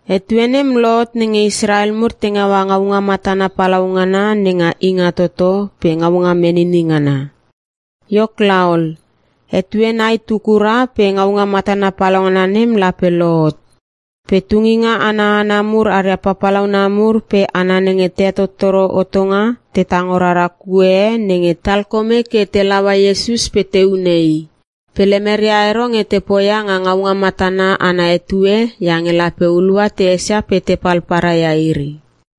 Etue nem lohot nenge Israel mur te ngaua ngaunga matana palau ngana nenga Ingatoto pe Ngaunga Menini Ngana. Iok laol, etue nai tu kura pe ngaunga matana palaungana nem lape lohot. Pe tunginga ana hana mur aria papalauna mur pe hana nenge te hetottoro hotonga te tango rara kue e nenge talkome ke te laua Iesus pe te hune i. Pe lemeria ero nge te poia nga ngaunga matana ana etue iange lape hulua te esia pe tepal paria ia iri.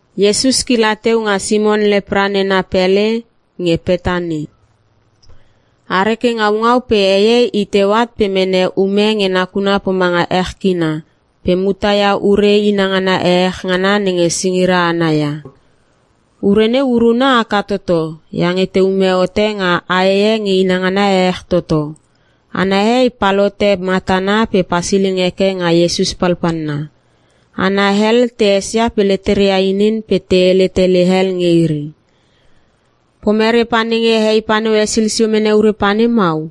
Iesus kila teu nga Simon Lepra nena pele nge Petani. Are ke ngaungau pe hei e i teu at pe mene um e nge nakuna pomanga ech kina pe mutaia ure inangana ehech ngana nenge singira ana ia. Ure neu uruna haka toto iange te ume hote nga ae e nge inangana ehech toto. Ana hei palhote matana pe pasiling heke nga Iesus palpalna. Hana hel te esia pe leteria inin pe te hele tele hel nge iri, “Pomere pa nenge hei paneu hesil sio mene ure paneu mau?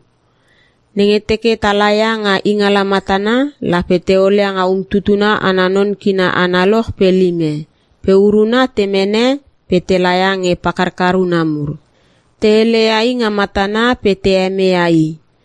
Nenge teke te laia nga ingala matana, lape te olia nga umtutuna ana non kina analoch pe lime pe uruna te mene pe te laia nge pakarkar una mur!” Te heleia i nga matana pe te hemeia i.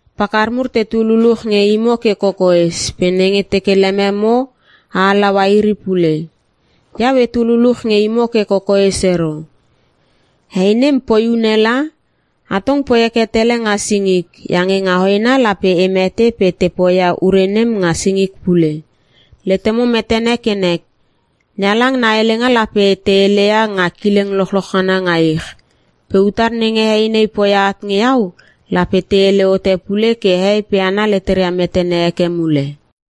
Pakar mur tetu luluch nge imo ke kokoes pe nenge teke lememo, a halaua iri pule. Iau etu luluch nge imo ke kokoes ero. Hei nem poi une la. Atong poi heke tele nga singik iange nga hoena lape e mete pe te poia ure nem nga singik pule. Letemo metene ke nek! NeHalang na helenga lape te heleia nga kileng lochloch ngana nga ich. Pe utar nenge hei nei poia at nge iau, lape te hele hote pule ke hehei pe hana leteria metene heke mule.”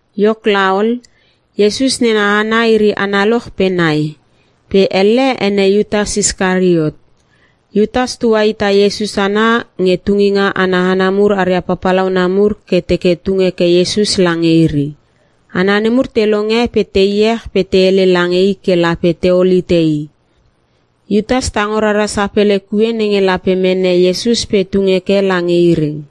Iok laol, Iesus nena hana iri analoch pe nai, pe elle ene Iutas Iskariot. Iutas tuahita Iesus ana nge tunginga ana hana mur aria papalauna mur ke teke tung heke Iesus lange iri. Hana nemur te longe pe te iech pe te hele lange i ke lape teol hite i. Iutas tango rara sapele kue nenge lape mene Iesus pe tung heke lange iri.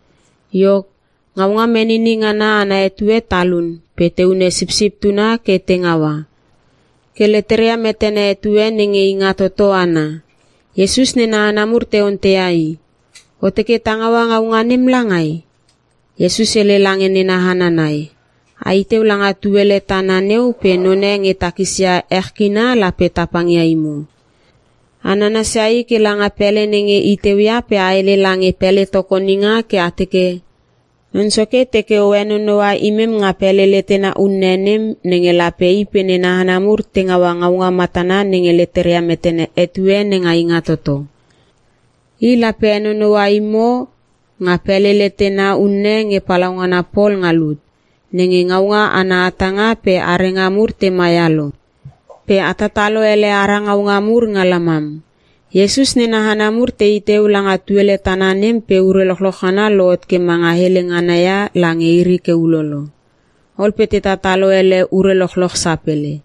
Iok, Ngaunga Menini Ngana ana etue talun pe te hune Sipsip Tuna ke te ngaua, ke leteria metene etue nenge Ingatoto ana. Iesus nena hana mur te onteia i, “O teke ta ngaua ngaunga nem langai?” Iesus hele lange nena hana nai, “Ai teu langa tuele tana neu pe none nge takisia ech kina lape tapang ia imo. A nanasia i kela nga pele nenge i teuia pe a hele lange pele tokoninga ke a teke, ‘Non Soke teke o henonoua imem nga pele letena unne nem, nenge lape i pe nena hana mur te ngaua ngaunga matana nenge letera metene etue nenga Ingatoto.’ I lape henonoua imo nga pele letena unne nge palaungana pol nga lut, nenge ngaunga ana hatanga pe arenga mur te maia lo. Pe a tatalo ele ara ngaunga mur nga lamam.” Iesus nena hana mur tei teu langa tuele tana nem pe ure lochloch ngana lohot ke manga hele ngana ia lange iri ke ulolo. Ol pe te tatalo ele ure lochloch sapele.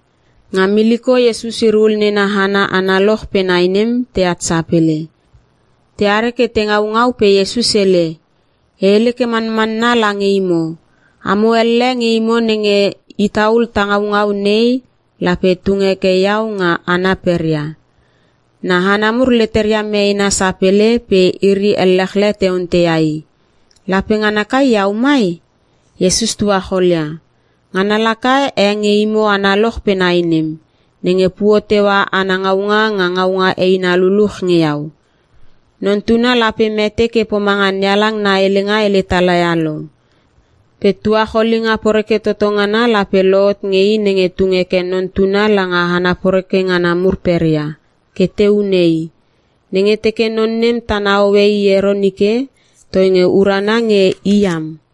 Nga miliko Iesus iri hul nena hana analoch pe nai nem, teat sapele. Te are ke te ngaungau pe Iesus hele, “E hele ke manmanna lange imo, amo elle nge imo nenge ita ul ta ngaungau nei, lape tung heke iau nga hana peria.” Na hana mur leteria meena sapele pe iri ellechle te onteia i, “Lape ngana kai iau mai?” Iesus tuacholia, “Ngana laka e nge imo analoch pe nai nem, nenge puo teua ana ngaunga nga ngaunga eina luluch nge iau. Non Tuna lape mete ke pomanga NeHalang na helenga hele talaia lo. Pe tuacholinga poreke toto ngana, lape lohot nge i nenge tung heke Non Tuna langa hana poreke ngana mur peria, ke te hune! Nenge teke non nem tana hoe i ero nike, toinge urana nge i iam!”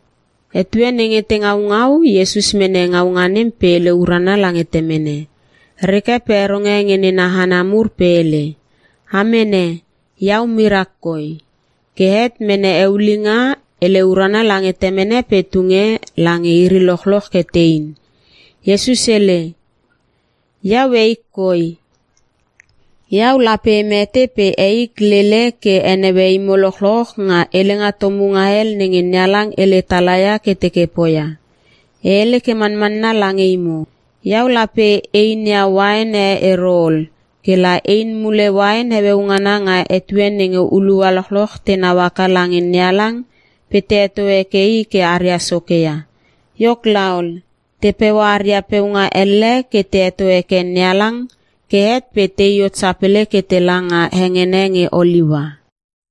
Etue nenge te ngaungau, Iesus mene ngaunga nem pe hele urana lange Temene, reke pe heronge nge nena hana mur pe hele, “A mene. Iau mirak koi.” Ke het mene eulinga, hele urana lange Temene pe tunge lange iri lochloch ke tein. Iesus hele, “Iau eik koi. Iau lape e mete pe eik lele ke heneue imo lochloch nga Helenga Tomunga Hel nenge NeHalang hele talaia ke teke poia. E hele ke manmanna lange imo, Iau lape einia uain e ero ol ke la ein mule uain heueu ngana nga etue nenge hulua lochloch tenau haka lange NeHalang pe te heto heke i ke aria soke ia.” Iok laol, te peua aria peunga elle ke te heto heke NeHalang ke het pe tei hot sapele ke tela nga hengene nge Oliua.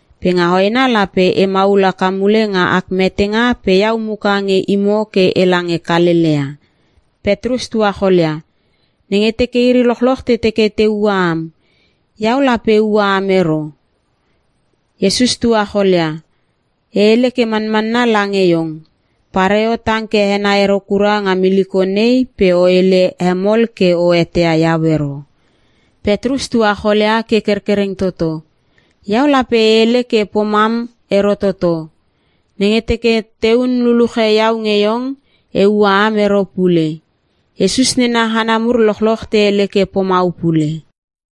Pe nga hoena lape e maul haka mule nga ak metenga pe iau muka nge imo ke ela nge Kalelea.” Petrus tuacholia, “Nenge teke iri lochloch te teke te ua am, iau lape e ua am ero!” Iesus tuacholia, “E hele ke manmanna lange iong. Pareo tang ke henai ero kura nga miliko nei, pe o hele he mol ke o eteia iau ero.” Petrus tuacholia ke kerkereng toto, “Iau lape e hele ke pomam ero toto. Nenge teke tehun luluche iau nge iong, e ua am ero pule!” Iesus nena hana mur lochloch te hele ke pomau pule.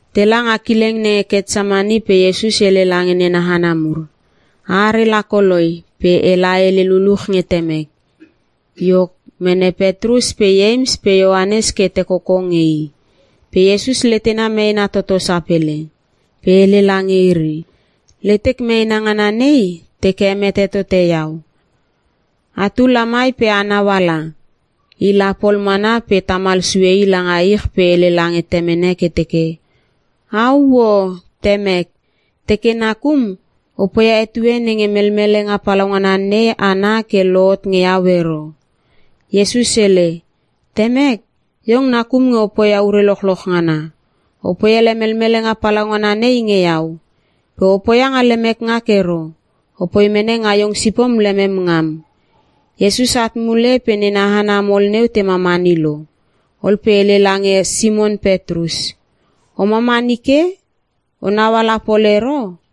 Tela nga kileng nenge Ketsemani pe Iesus hele lange nena hana mur, “A are la koloi pe ela e hele luluch nge Temek.” Iok, mene Petrus pe Ieims pe Ioanes ke te koko nge i. Pe Iesus letena meena toto sapele pe hele lange iri, “Letek meena ngana nei, teke hemete tote iau. Atu la mai pe a nauala.” I la pol mana pe tamal sue i lange ich pe hele lange Temene ke teke, “Auoo! Temek! Teke nakum, o poia etue nenge melmelenga palaungana nei ana ke lohot nge iau ero.” Iesus hele, “Temek, iong nakum nge o poia ure lochloch ngana. O poi ele melmelenga palaungana nei nge iau. Pe o poia nga lemek ngak ero, opoi mene nga iong sipom lemem ngam.” Iesus at mule pe nena hana mol neu te mamani lo. Ol pe hele lange Simon Petrus, “O mamani ke? Onau ala pol ero?”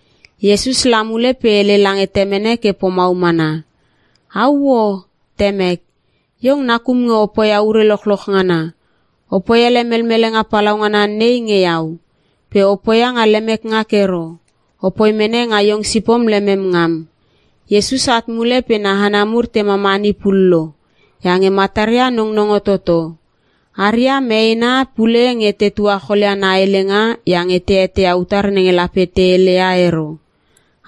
Iesus la mule pe hele lange temene ke pomau mana, “Auoo! Temek! Iong nakum nge o poia ure lochloch ngana. O poi ele melmelenga palaungana nei nge iau. Pe o poia nga lemek ngak ero. O poi mene nga iong sipom lemem ngam.” Iesus at mule pe na hana mur te mamani pullo, iange mataria nong nongo toto. Haria meena pule nge te tuacholia na helenga iange te eteia utar nenge lape te heleia ero.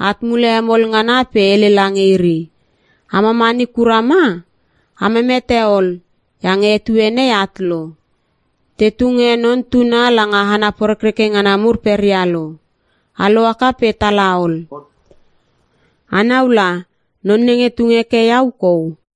At mule hemol ngana pe hele lange iri, “A mamamani kura ma? A memete ol! Iange etue nei at lo! Te tunge Non Tuna langa hana porekreke ngana mur peria lo. A lohaka pe tala ol. Anau la non nenge tung heke iau kou!”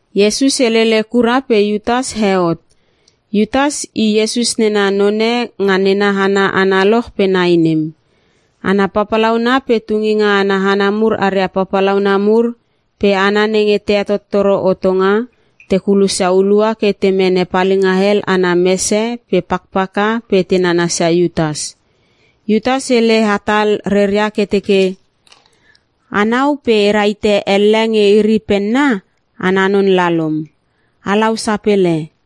Iesus helele kura pe Iutas he hot. Iutas i Iesus nena none nga nena hana analoch pe nai nem. Hana papalauna pe tunginga ana hana mur aria papalauna mur pe hana nenge te hetottoro hotonga, te kulosia hulua ke te mene palinga hel ana mese pe pakpaka pe te nanasia Iutas. Iutas hele hatal reria ke teke, “Anau pe e rahite elle nge iri penna, ana non la lom. Alau sapele.”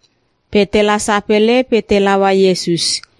Pe tela sapele pe te laua Iesus.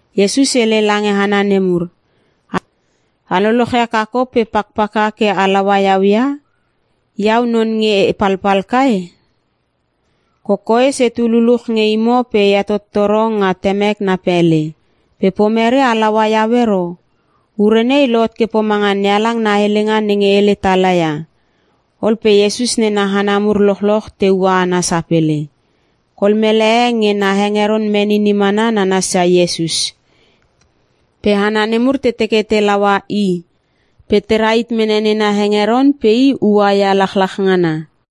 Iesus hele lange hana nemur, “A lolochia kakop pe pakpaka ke a laua iau ia? Iau non nge e palpal kai? Kokoes etu luluch nge imo pe e hetottoro nga Temek na pele. Pe pomere a laua iau ero? Ure nei lohot ke pomanga NeHalang na helenga nenge hele tala ia.” Ol pe Iesus nena hana mur lochloch te ua ana sapele. Kol mele e nge na hengeron menini mana nananasia Iesus. Pe hana nemur te teke te laua i pe te rahit mene nena hengeron pe i ua ia lachlach ngana.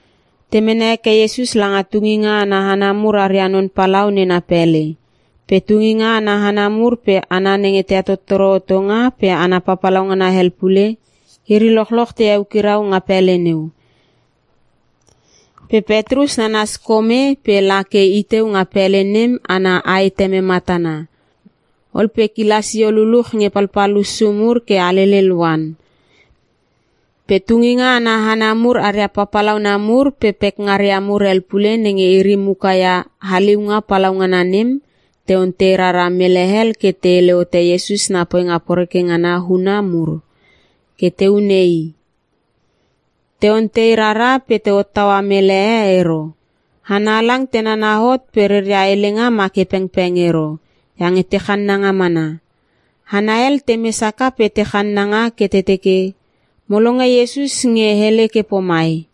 Te mene heke Iesus langa tunginga ana hana mur aria non palau nena pele. Pe tunginga ana hana mur pe hana nenge te hetottoro hotonga pe hana papalaunga hel pule, iri lochloch te eukirau nga pele neu. Pe Petrus nanas kome pe la ke i teu nga pele nem ana aeteme matana. Ol pe kila sio luluch nge palpal hussu mur ke alelel oan. Pe tunginga ana hana mur aria papalauna mur, pe pekngaria mur hel pule nenge iri muka ia haliunga palaungana nem, te ontei rara mele hel ke te hele hote Iesus na poinga poreke ngana huuna mur, ke te hune i. Te ontei rara pe te hottaua mele e ero. Hana halang te nana hot pe reria helenga ma ke pengpeng ero, iange te channanga mana. Hana hel temes haka pe te channanga ke te teke: “Mo longe Iesus nge hele ke pomai,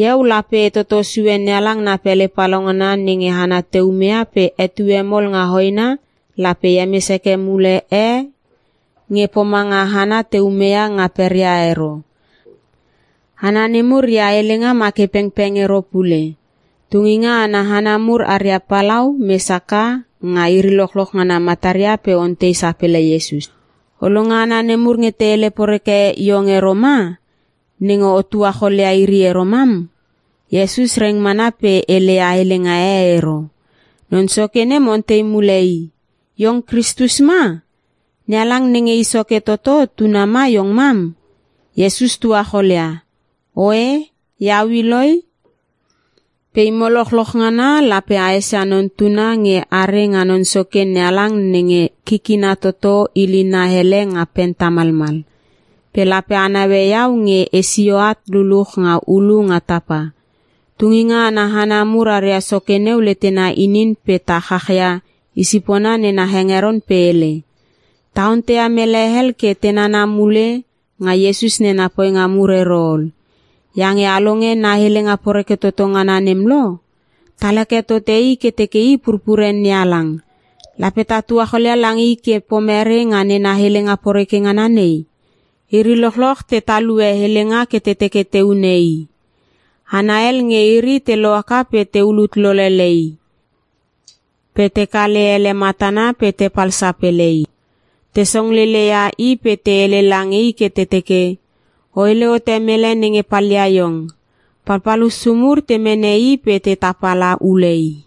‘Iau lape e toto sue NeHalang na pele palaungana nenge hana te umeia pe etue mol nga hoena lape e hemes heke mule e nge pomanga hana te ume ia nga peria ero.’” Hana nemur reia helenga ma ke pengpeng ero pule. Tunginga ana hana mur aria palau, mes haka nga iri lochloch ngana mataria pe ontei sapele Iesus, “O longe hana nemur nge te hele poreke iong ero ma, nenge o tuacholia iri ero mam?” Iesus reng mana pe heleia helenga e ero. Non soke nem ontei mule i, “Iong Kristus ma? NeHalang nenge i soke toto, tuna ma iong mam?” Iesus tuacholia, “Oe iau i loi. Pe imo lochloch ngana lape a esia Non Tuna nge are nga Non Soke NeHalang nenge kikina toto ilina hele nga pen tamalmal. Pe lape a naue iau nge e sio at luluch nga ulu nga tapa.” Tunginga ana hana mur aria soke neu letena inin pe ta chachia isipona nena hengeron pe hele, “Ta onteia mele hel ke te nana mule nga Iesus nena poinga mur ero ol, iange a longe na helenga poreke toto ngana nem lo! Tal heke tote i ke teke i pupure NeHalang. Lape ta tuacholia lange i ke pomere nga nena helenga poreke ngana nei?” Iri lochloch te talue helenga ke te teke te hune i. Hana hel nge iri te lohaka pe te ulut lolele i. Pe te kale ele matana pe tepal sapele i. Te songlele ia i pe te hele lange i ke te teke, “O hele hote mele nenge palia iong.” Palpal hussu mur te mene i pe te tapala ule i.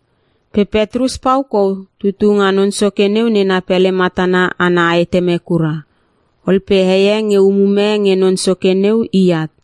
Pe Petrus pau kou tutu nga non soke neu nena pele matana ana aeteme kura. Ol pe hei e nge umume nge non soke neu i at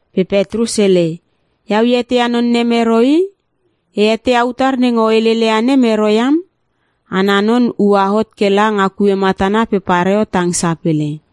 Pe Petrus hele, “Iau e eteia non nem ero i! E eteia utar nenge o heleleia nem ero iam.” Ana non ua hot kela nga kue matana pe pareo tang sapele.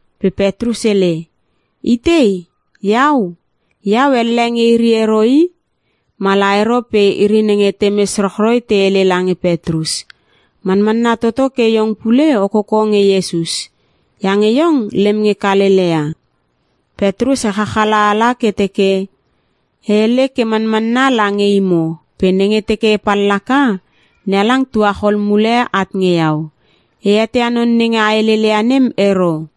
Pe Petrus hele, “Itei, iau? Iau elle nge iri ero i!” Mala ero pe iri nenge temes rochroi te hele lange Petrus, “Manmanna toto ke iong pule o koko nge Iesus, iange iong lem nge Kalelea.” Petrus echach ala ke teke, “E hele ke manmanna lange imo pe nenge teke e pallaka, NeHalang tuachol mule at nge iau! E eteia non nenge a heleleia nem ero!”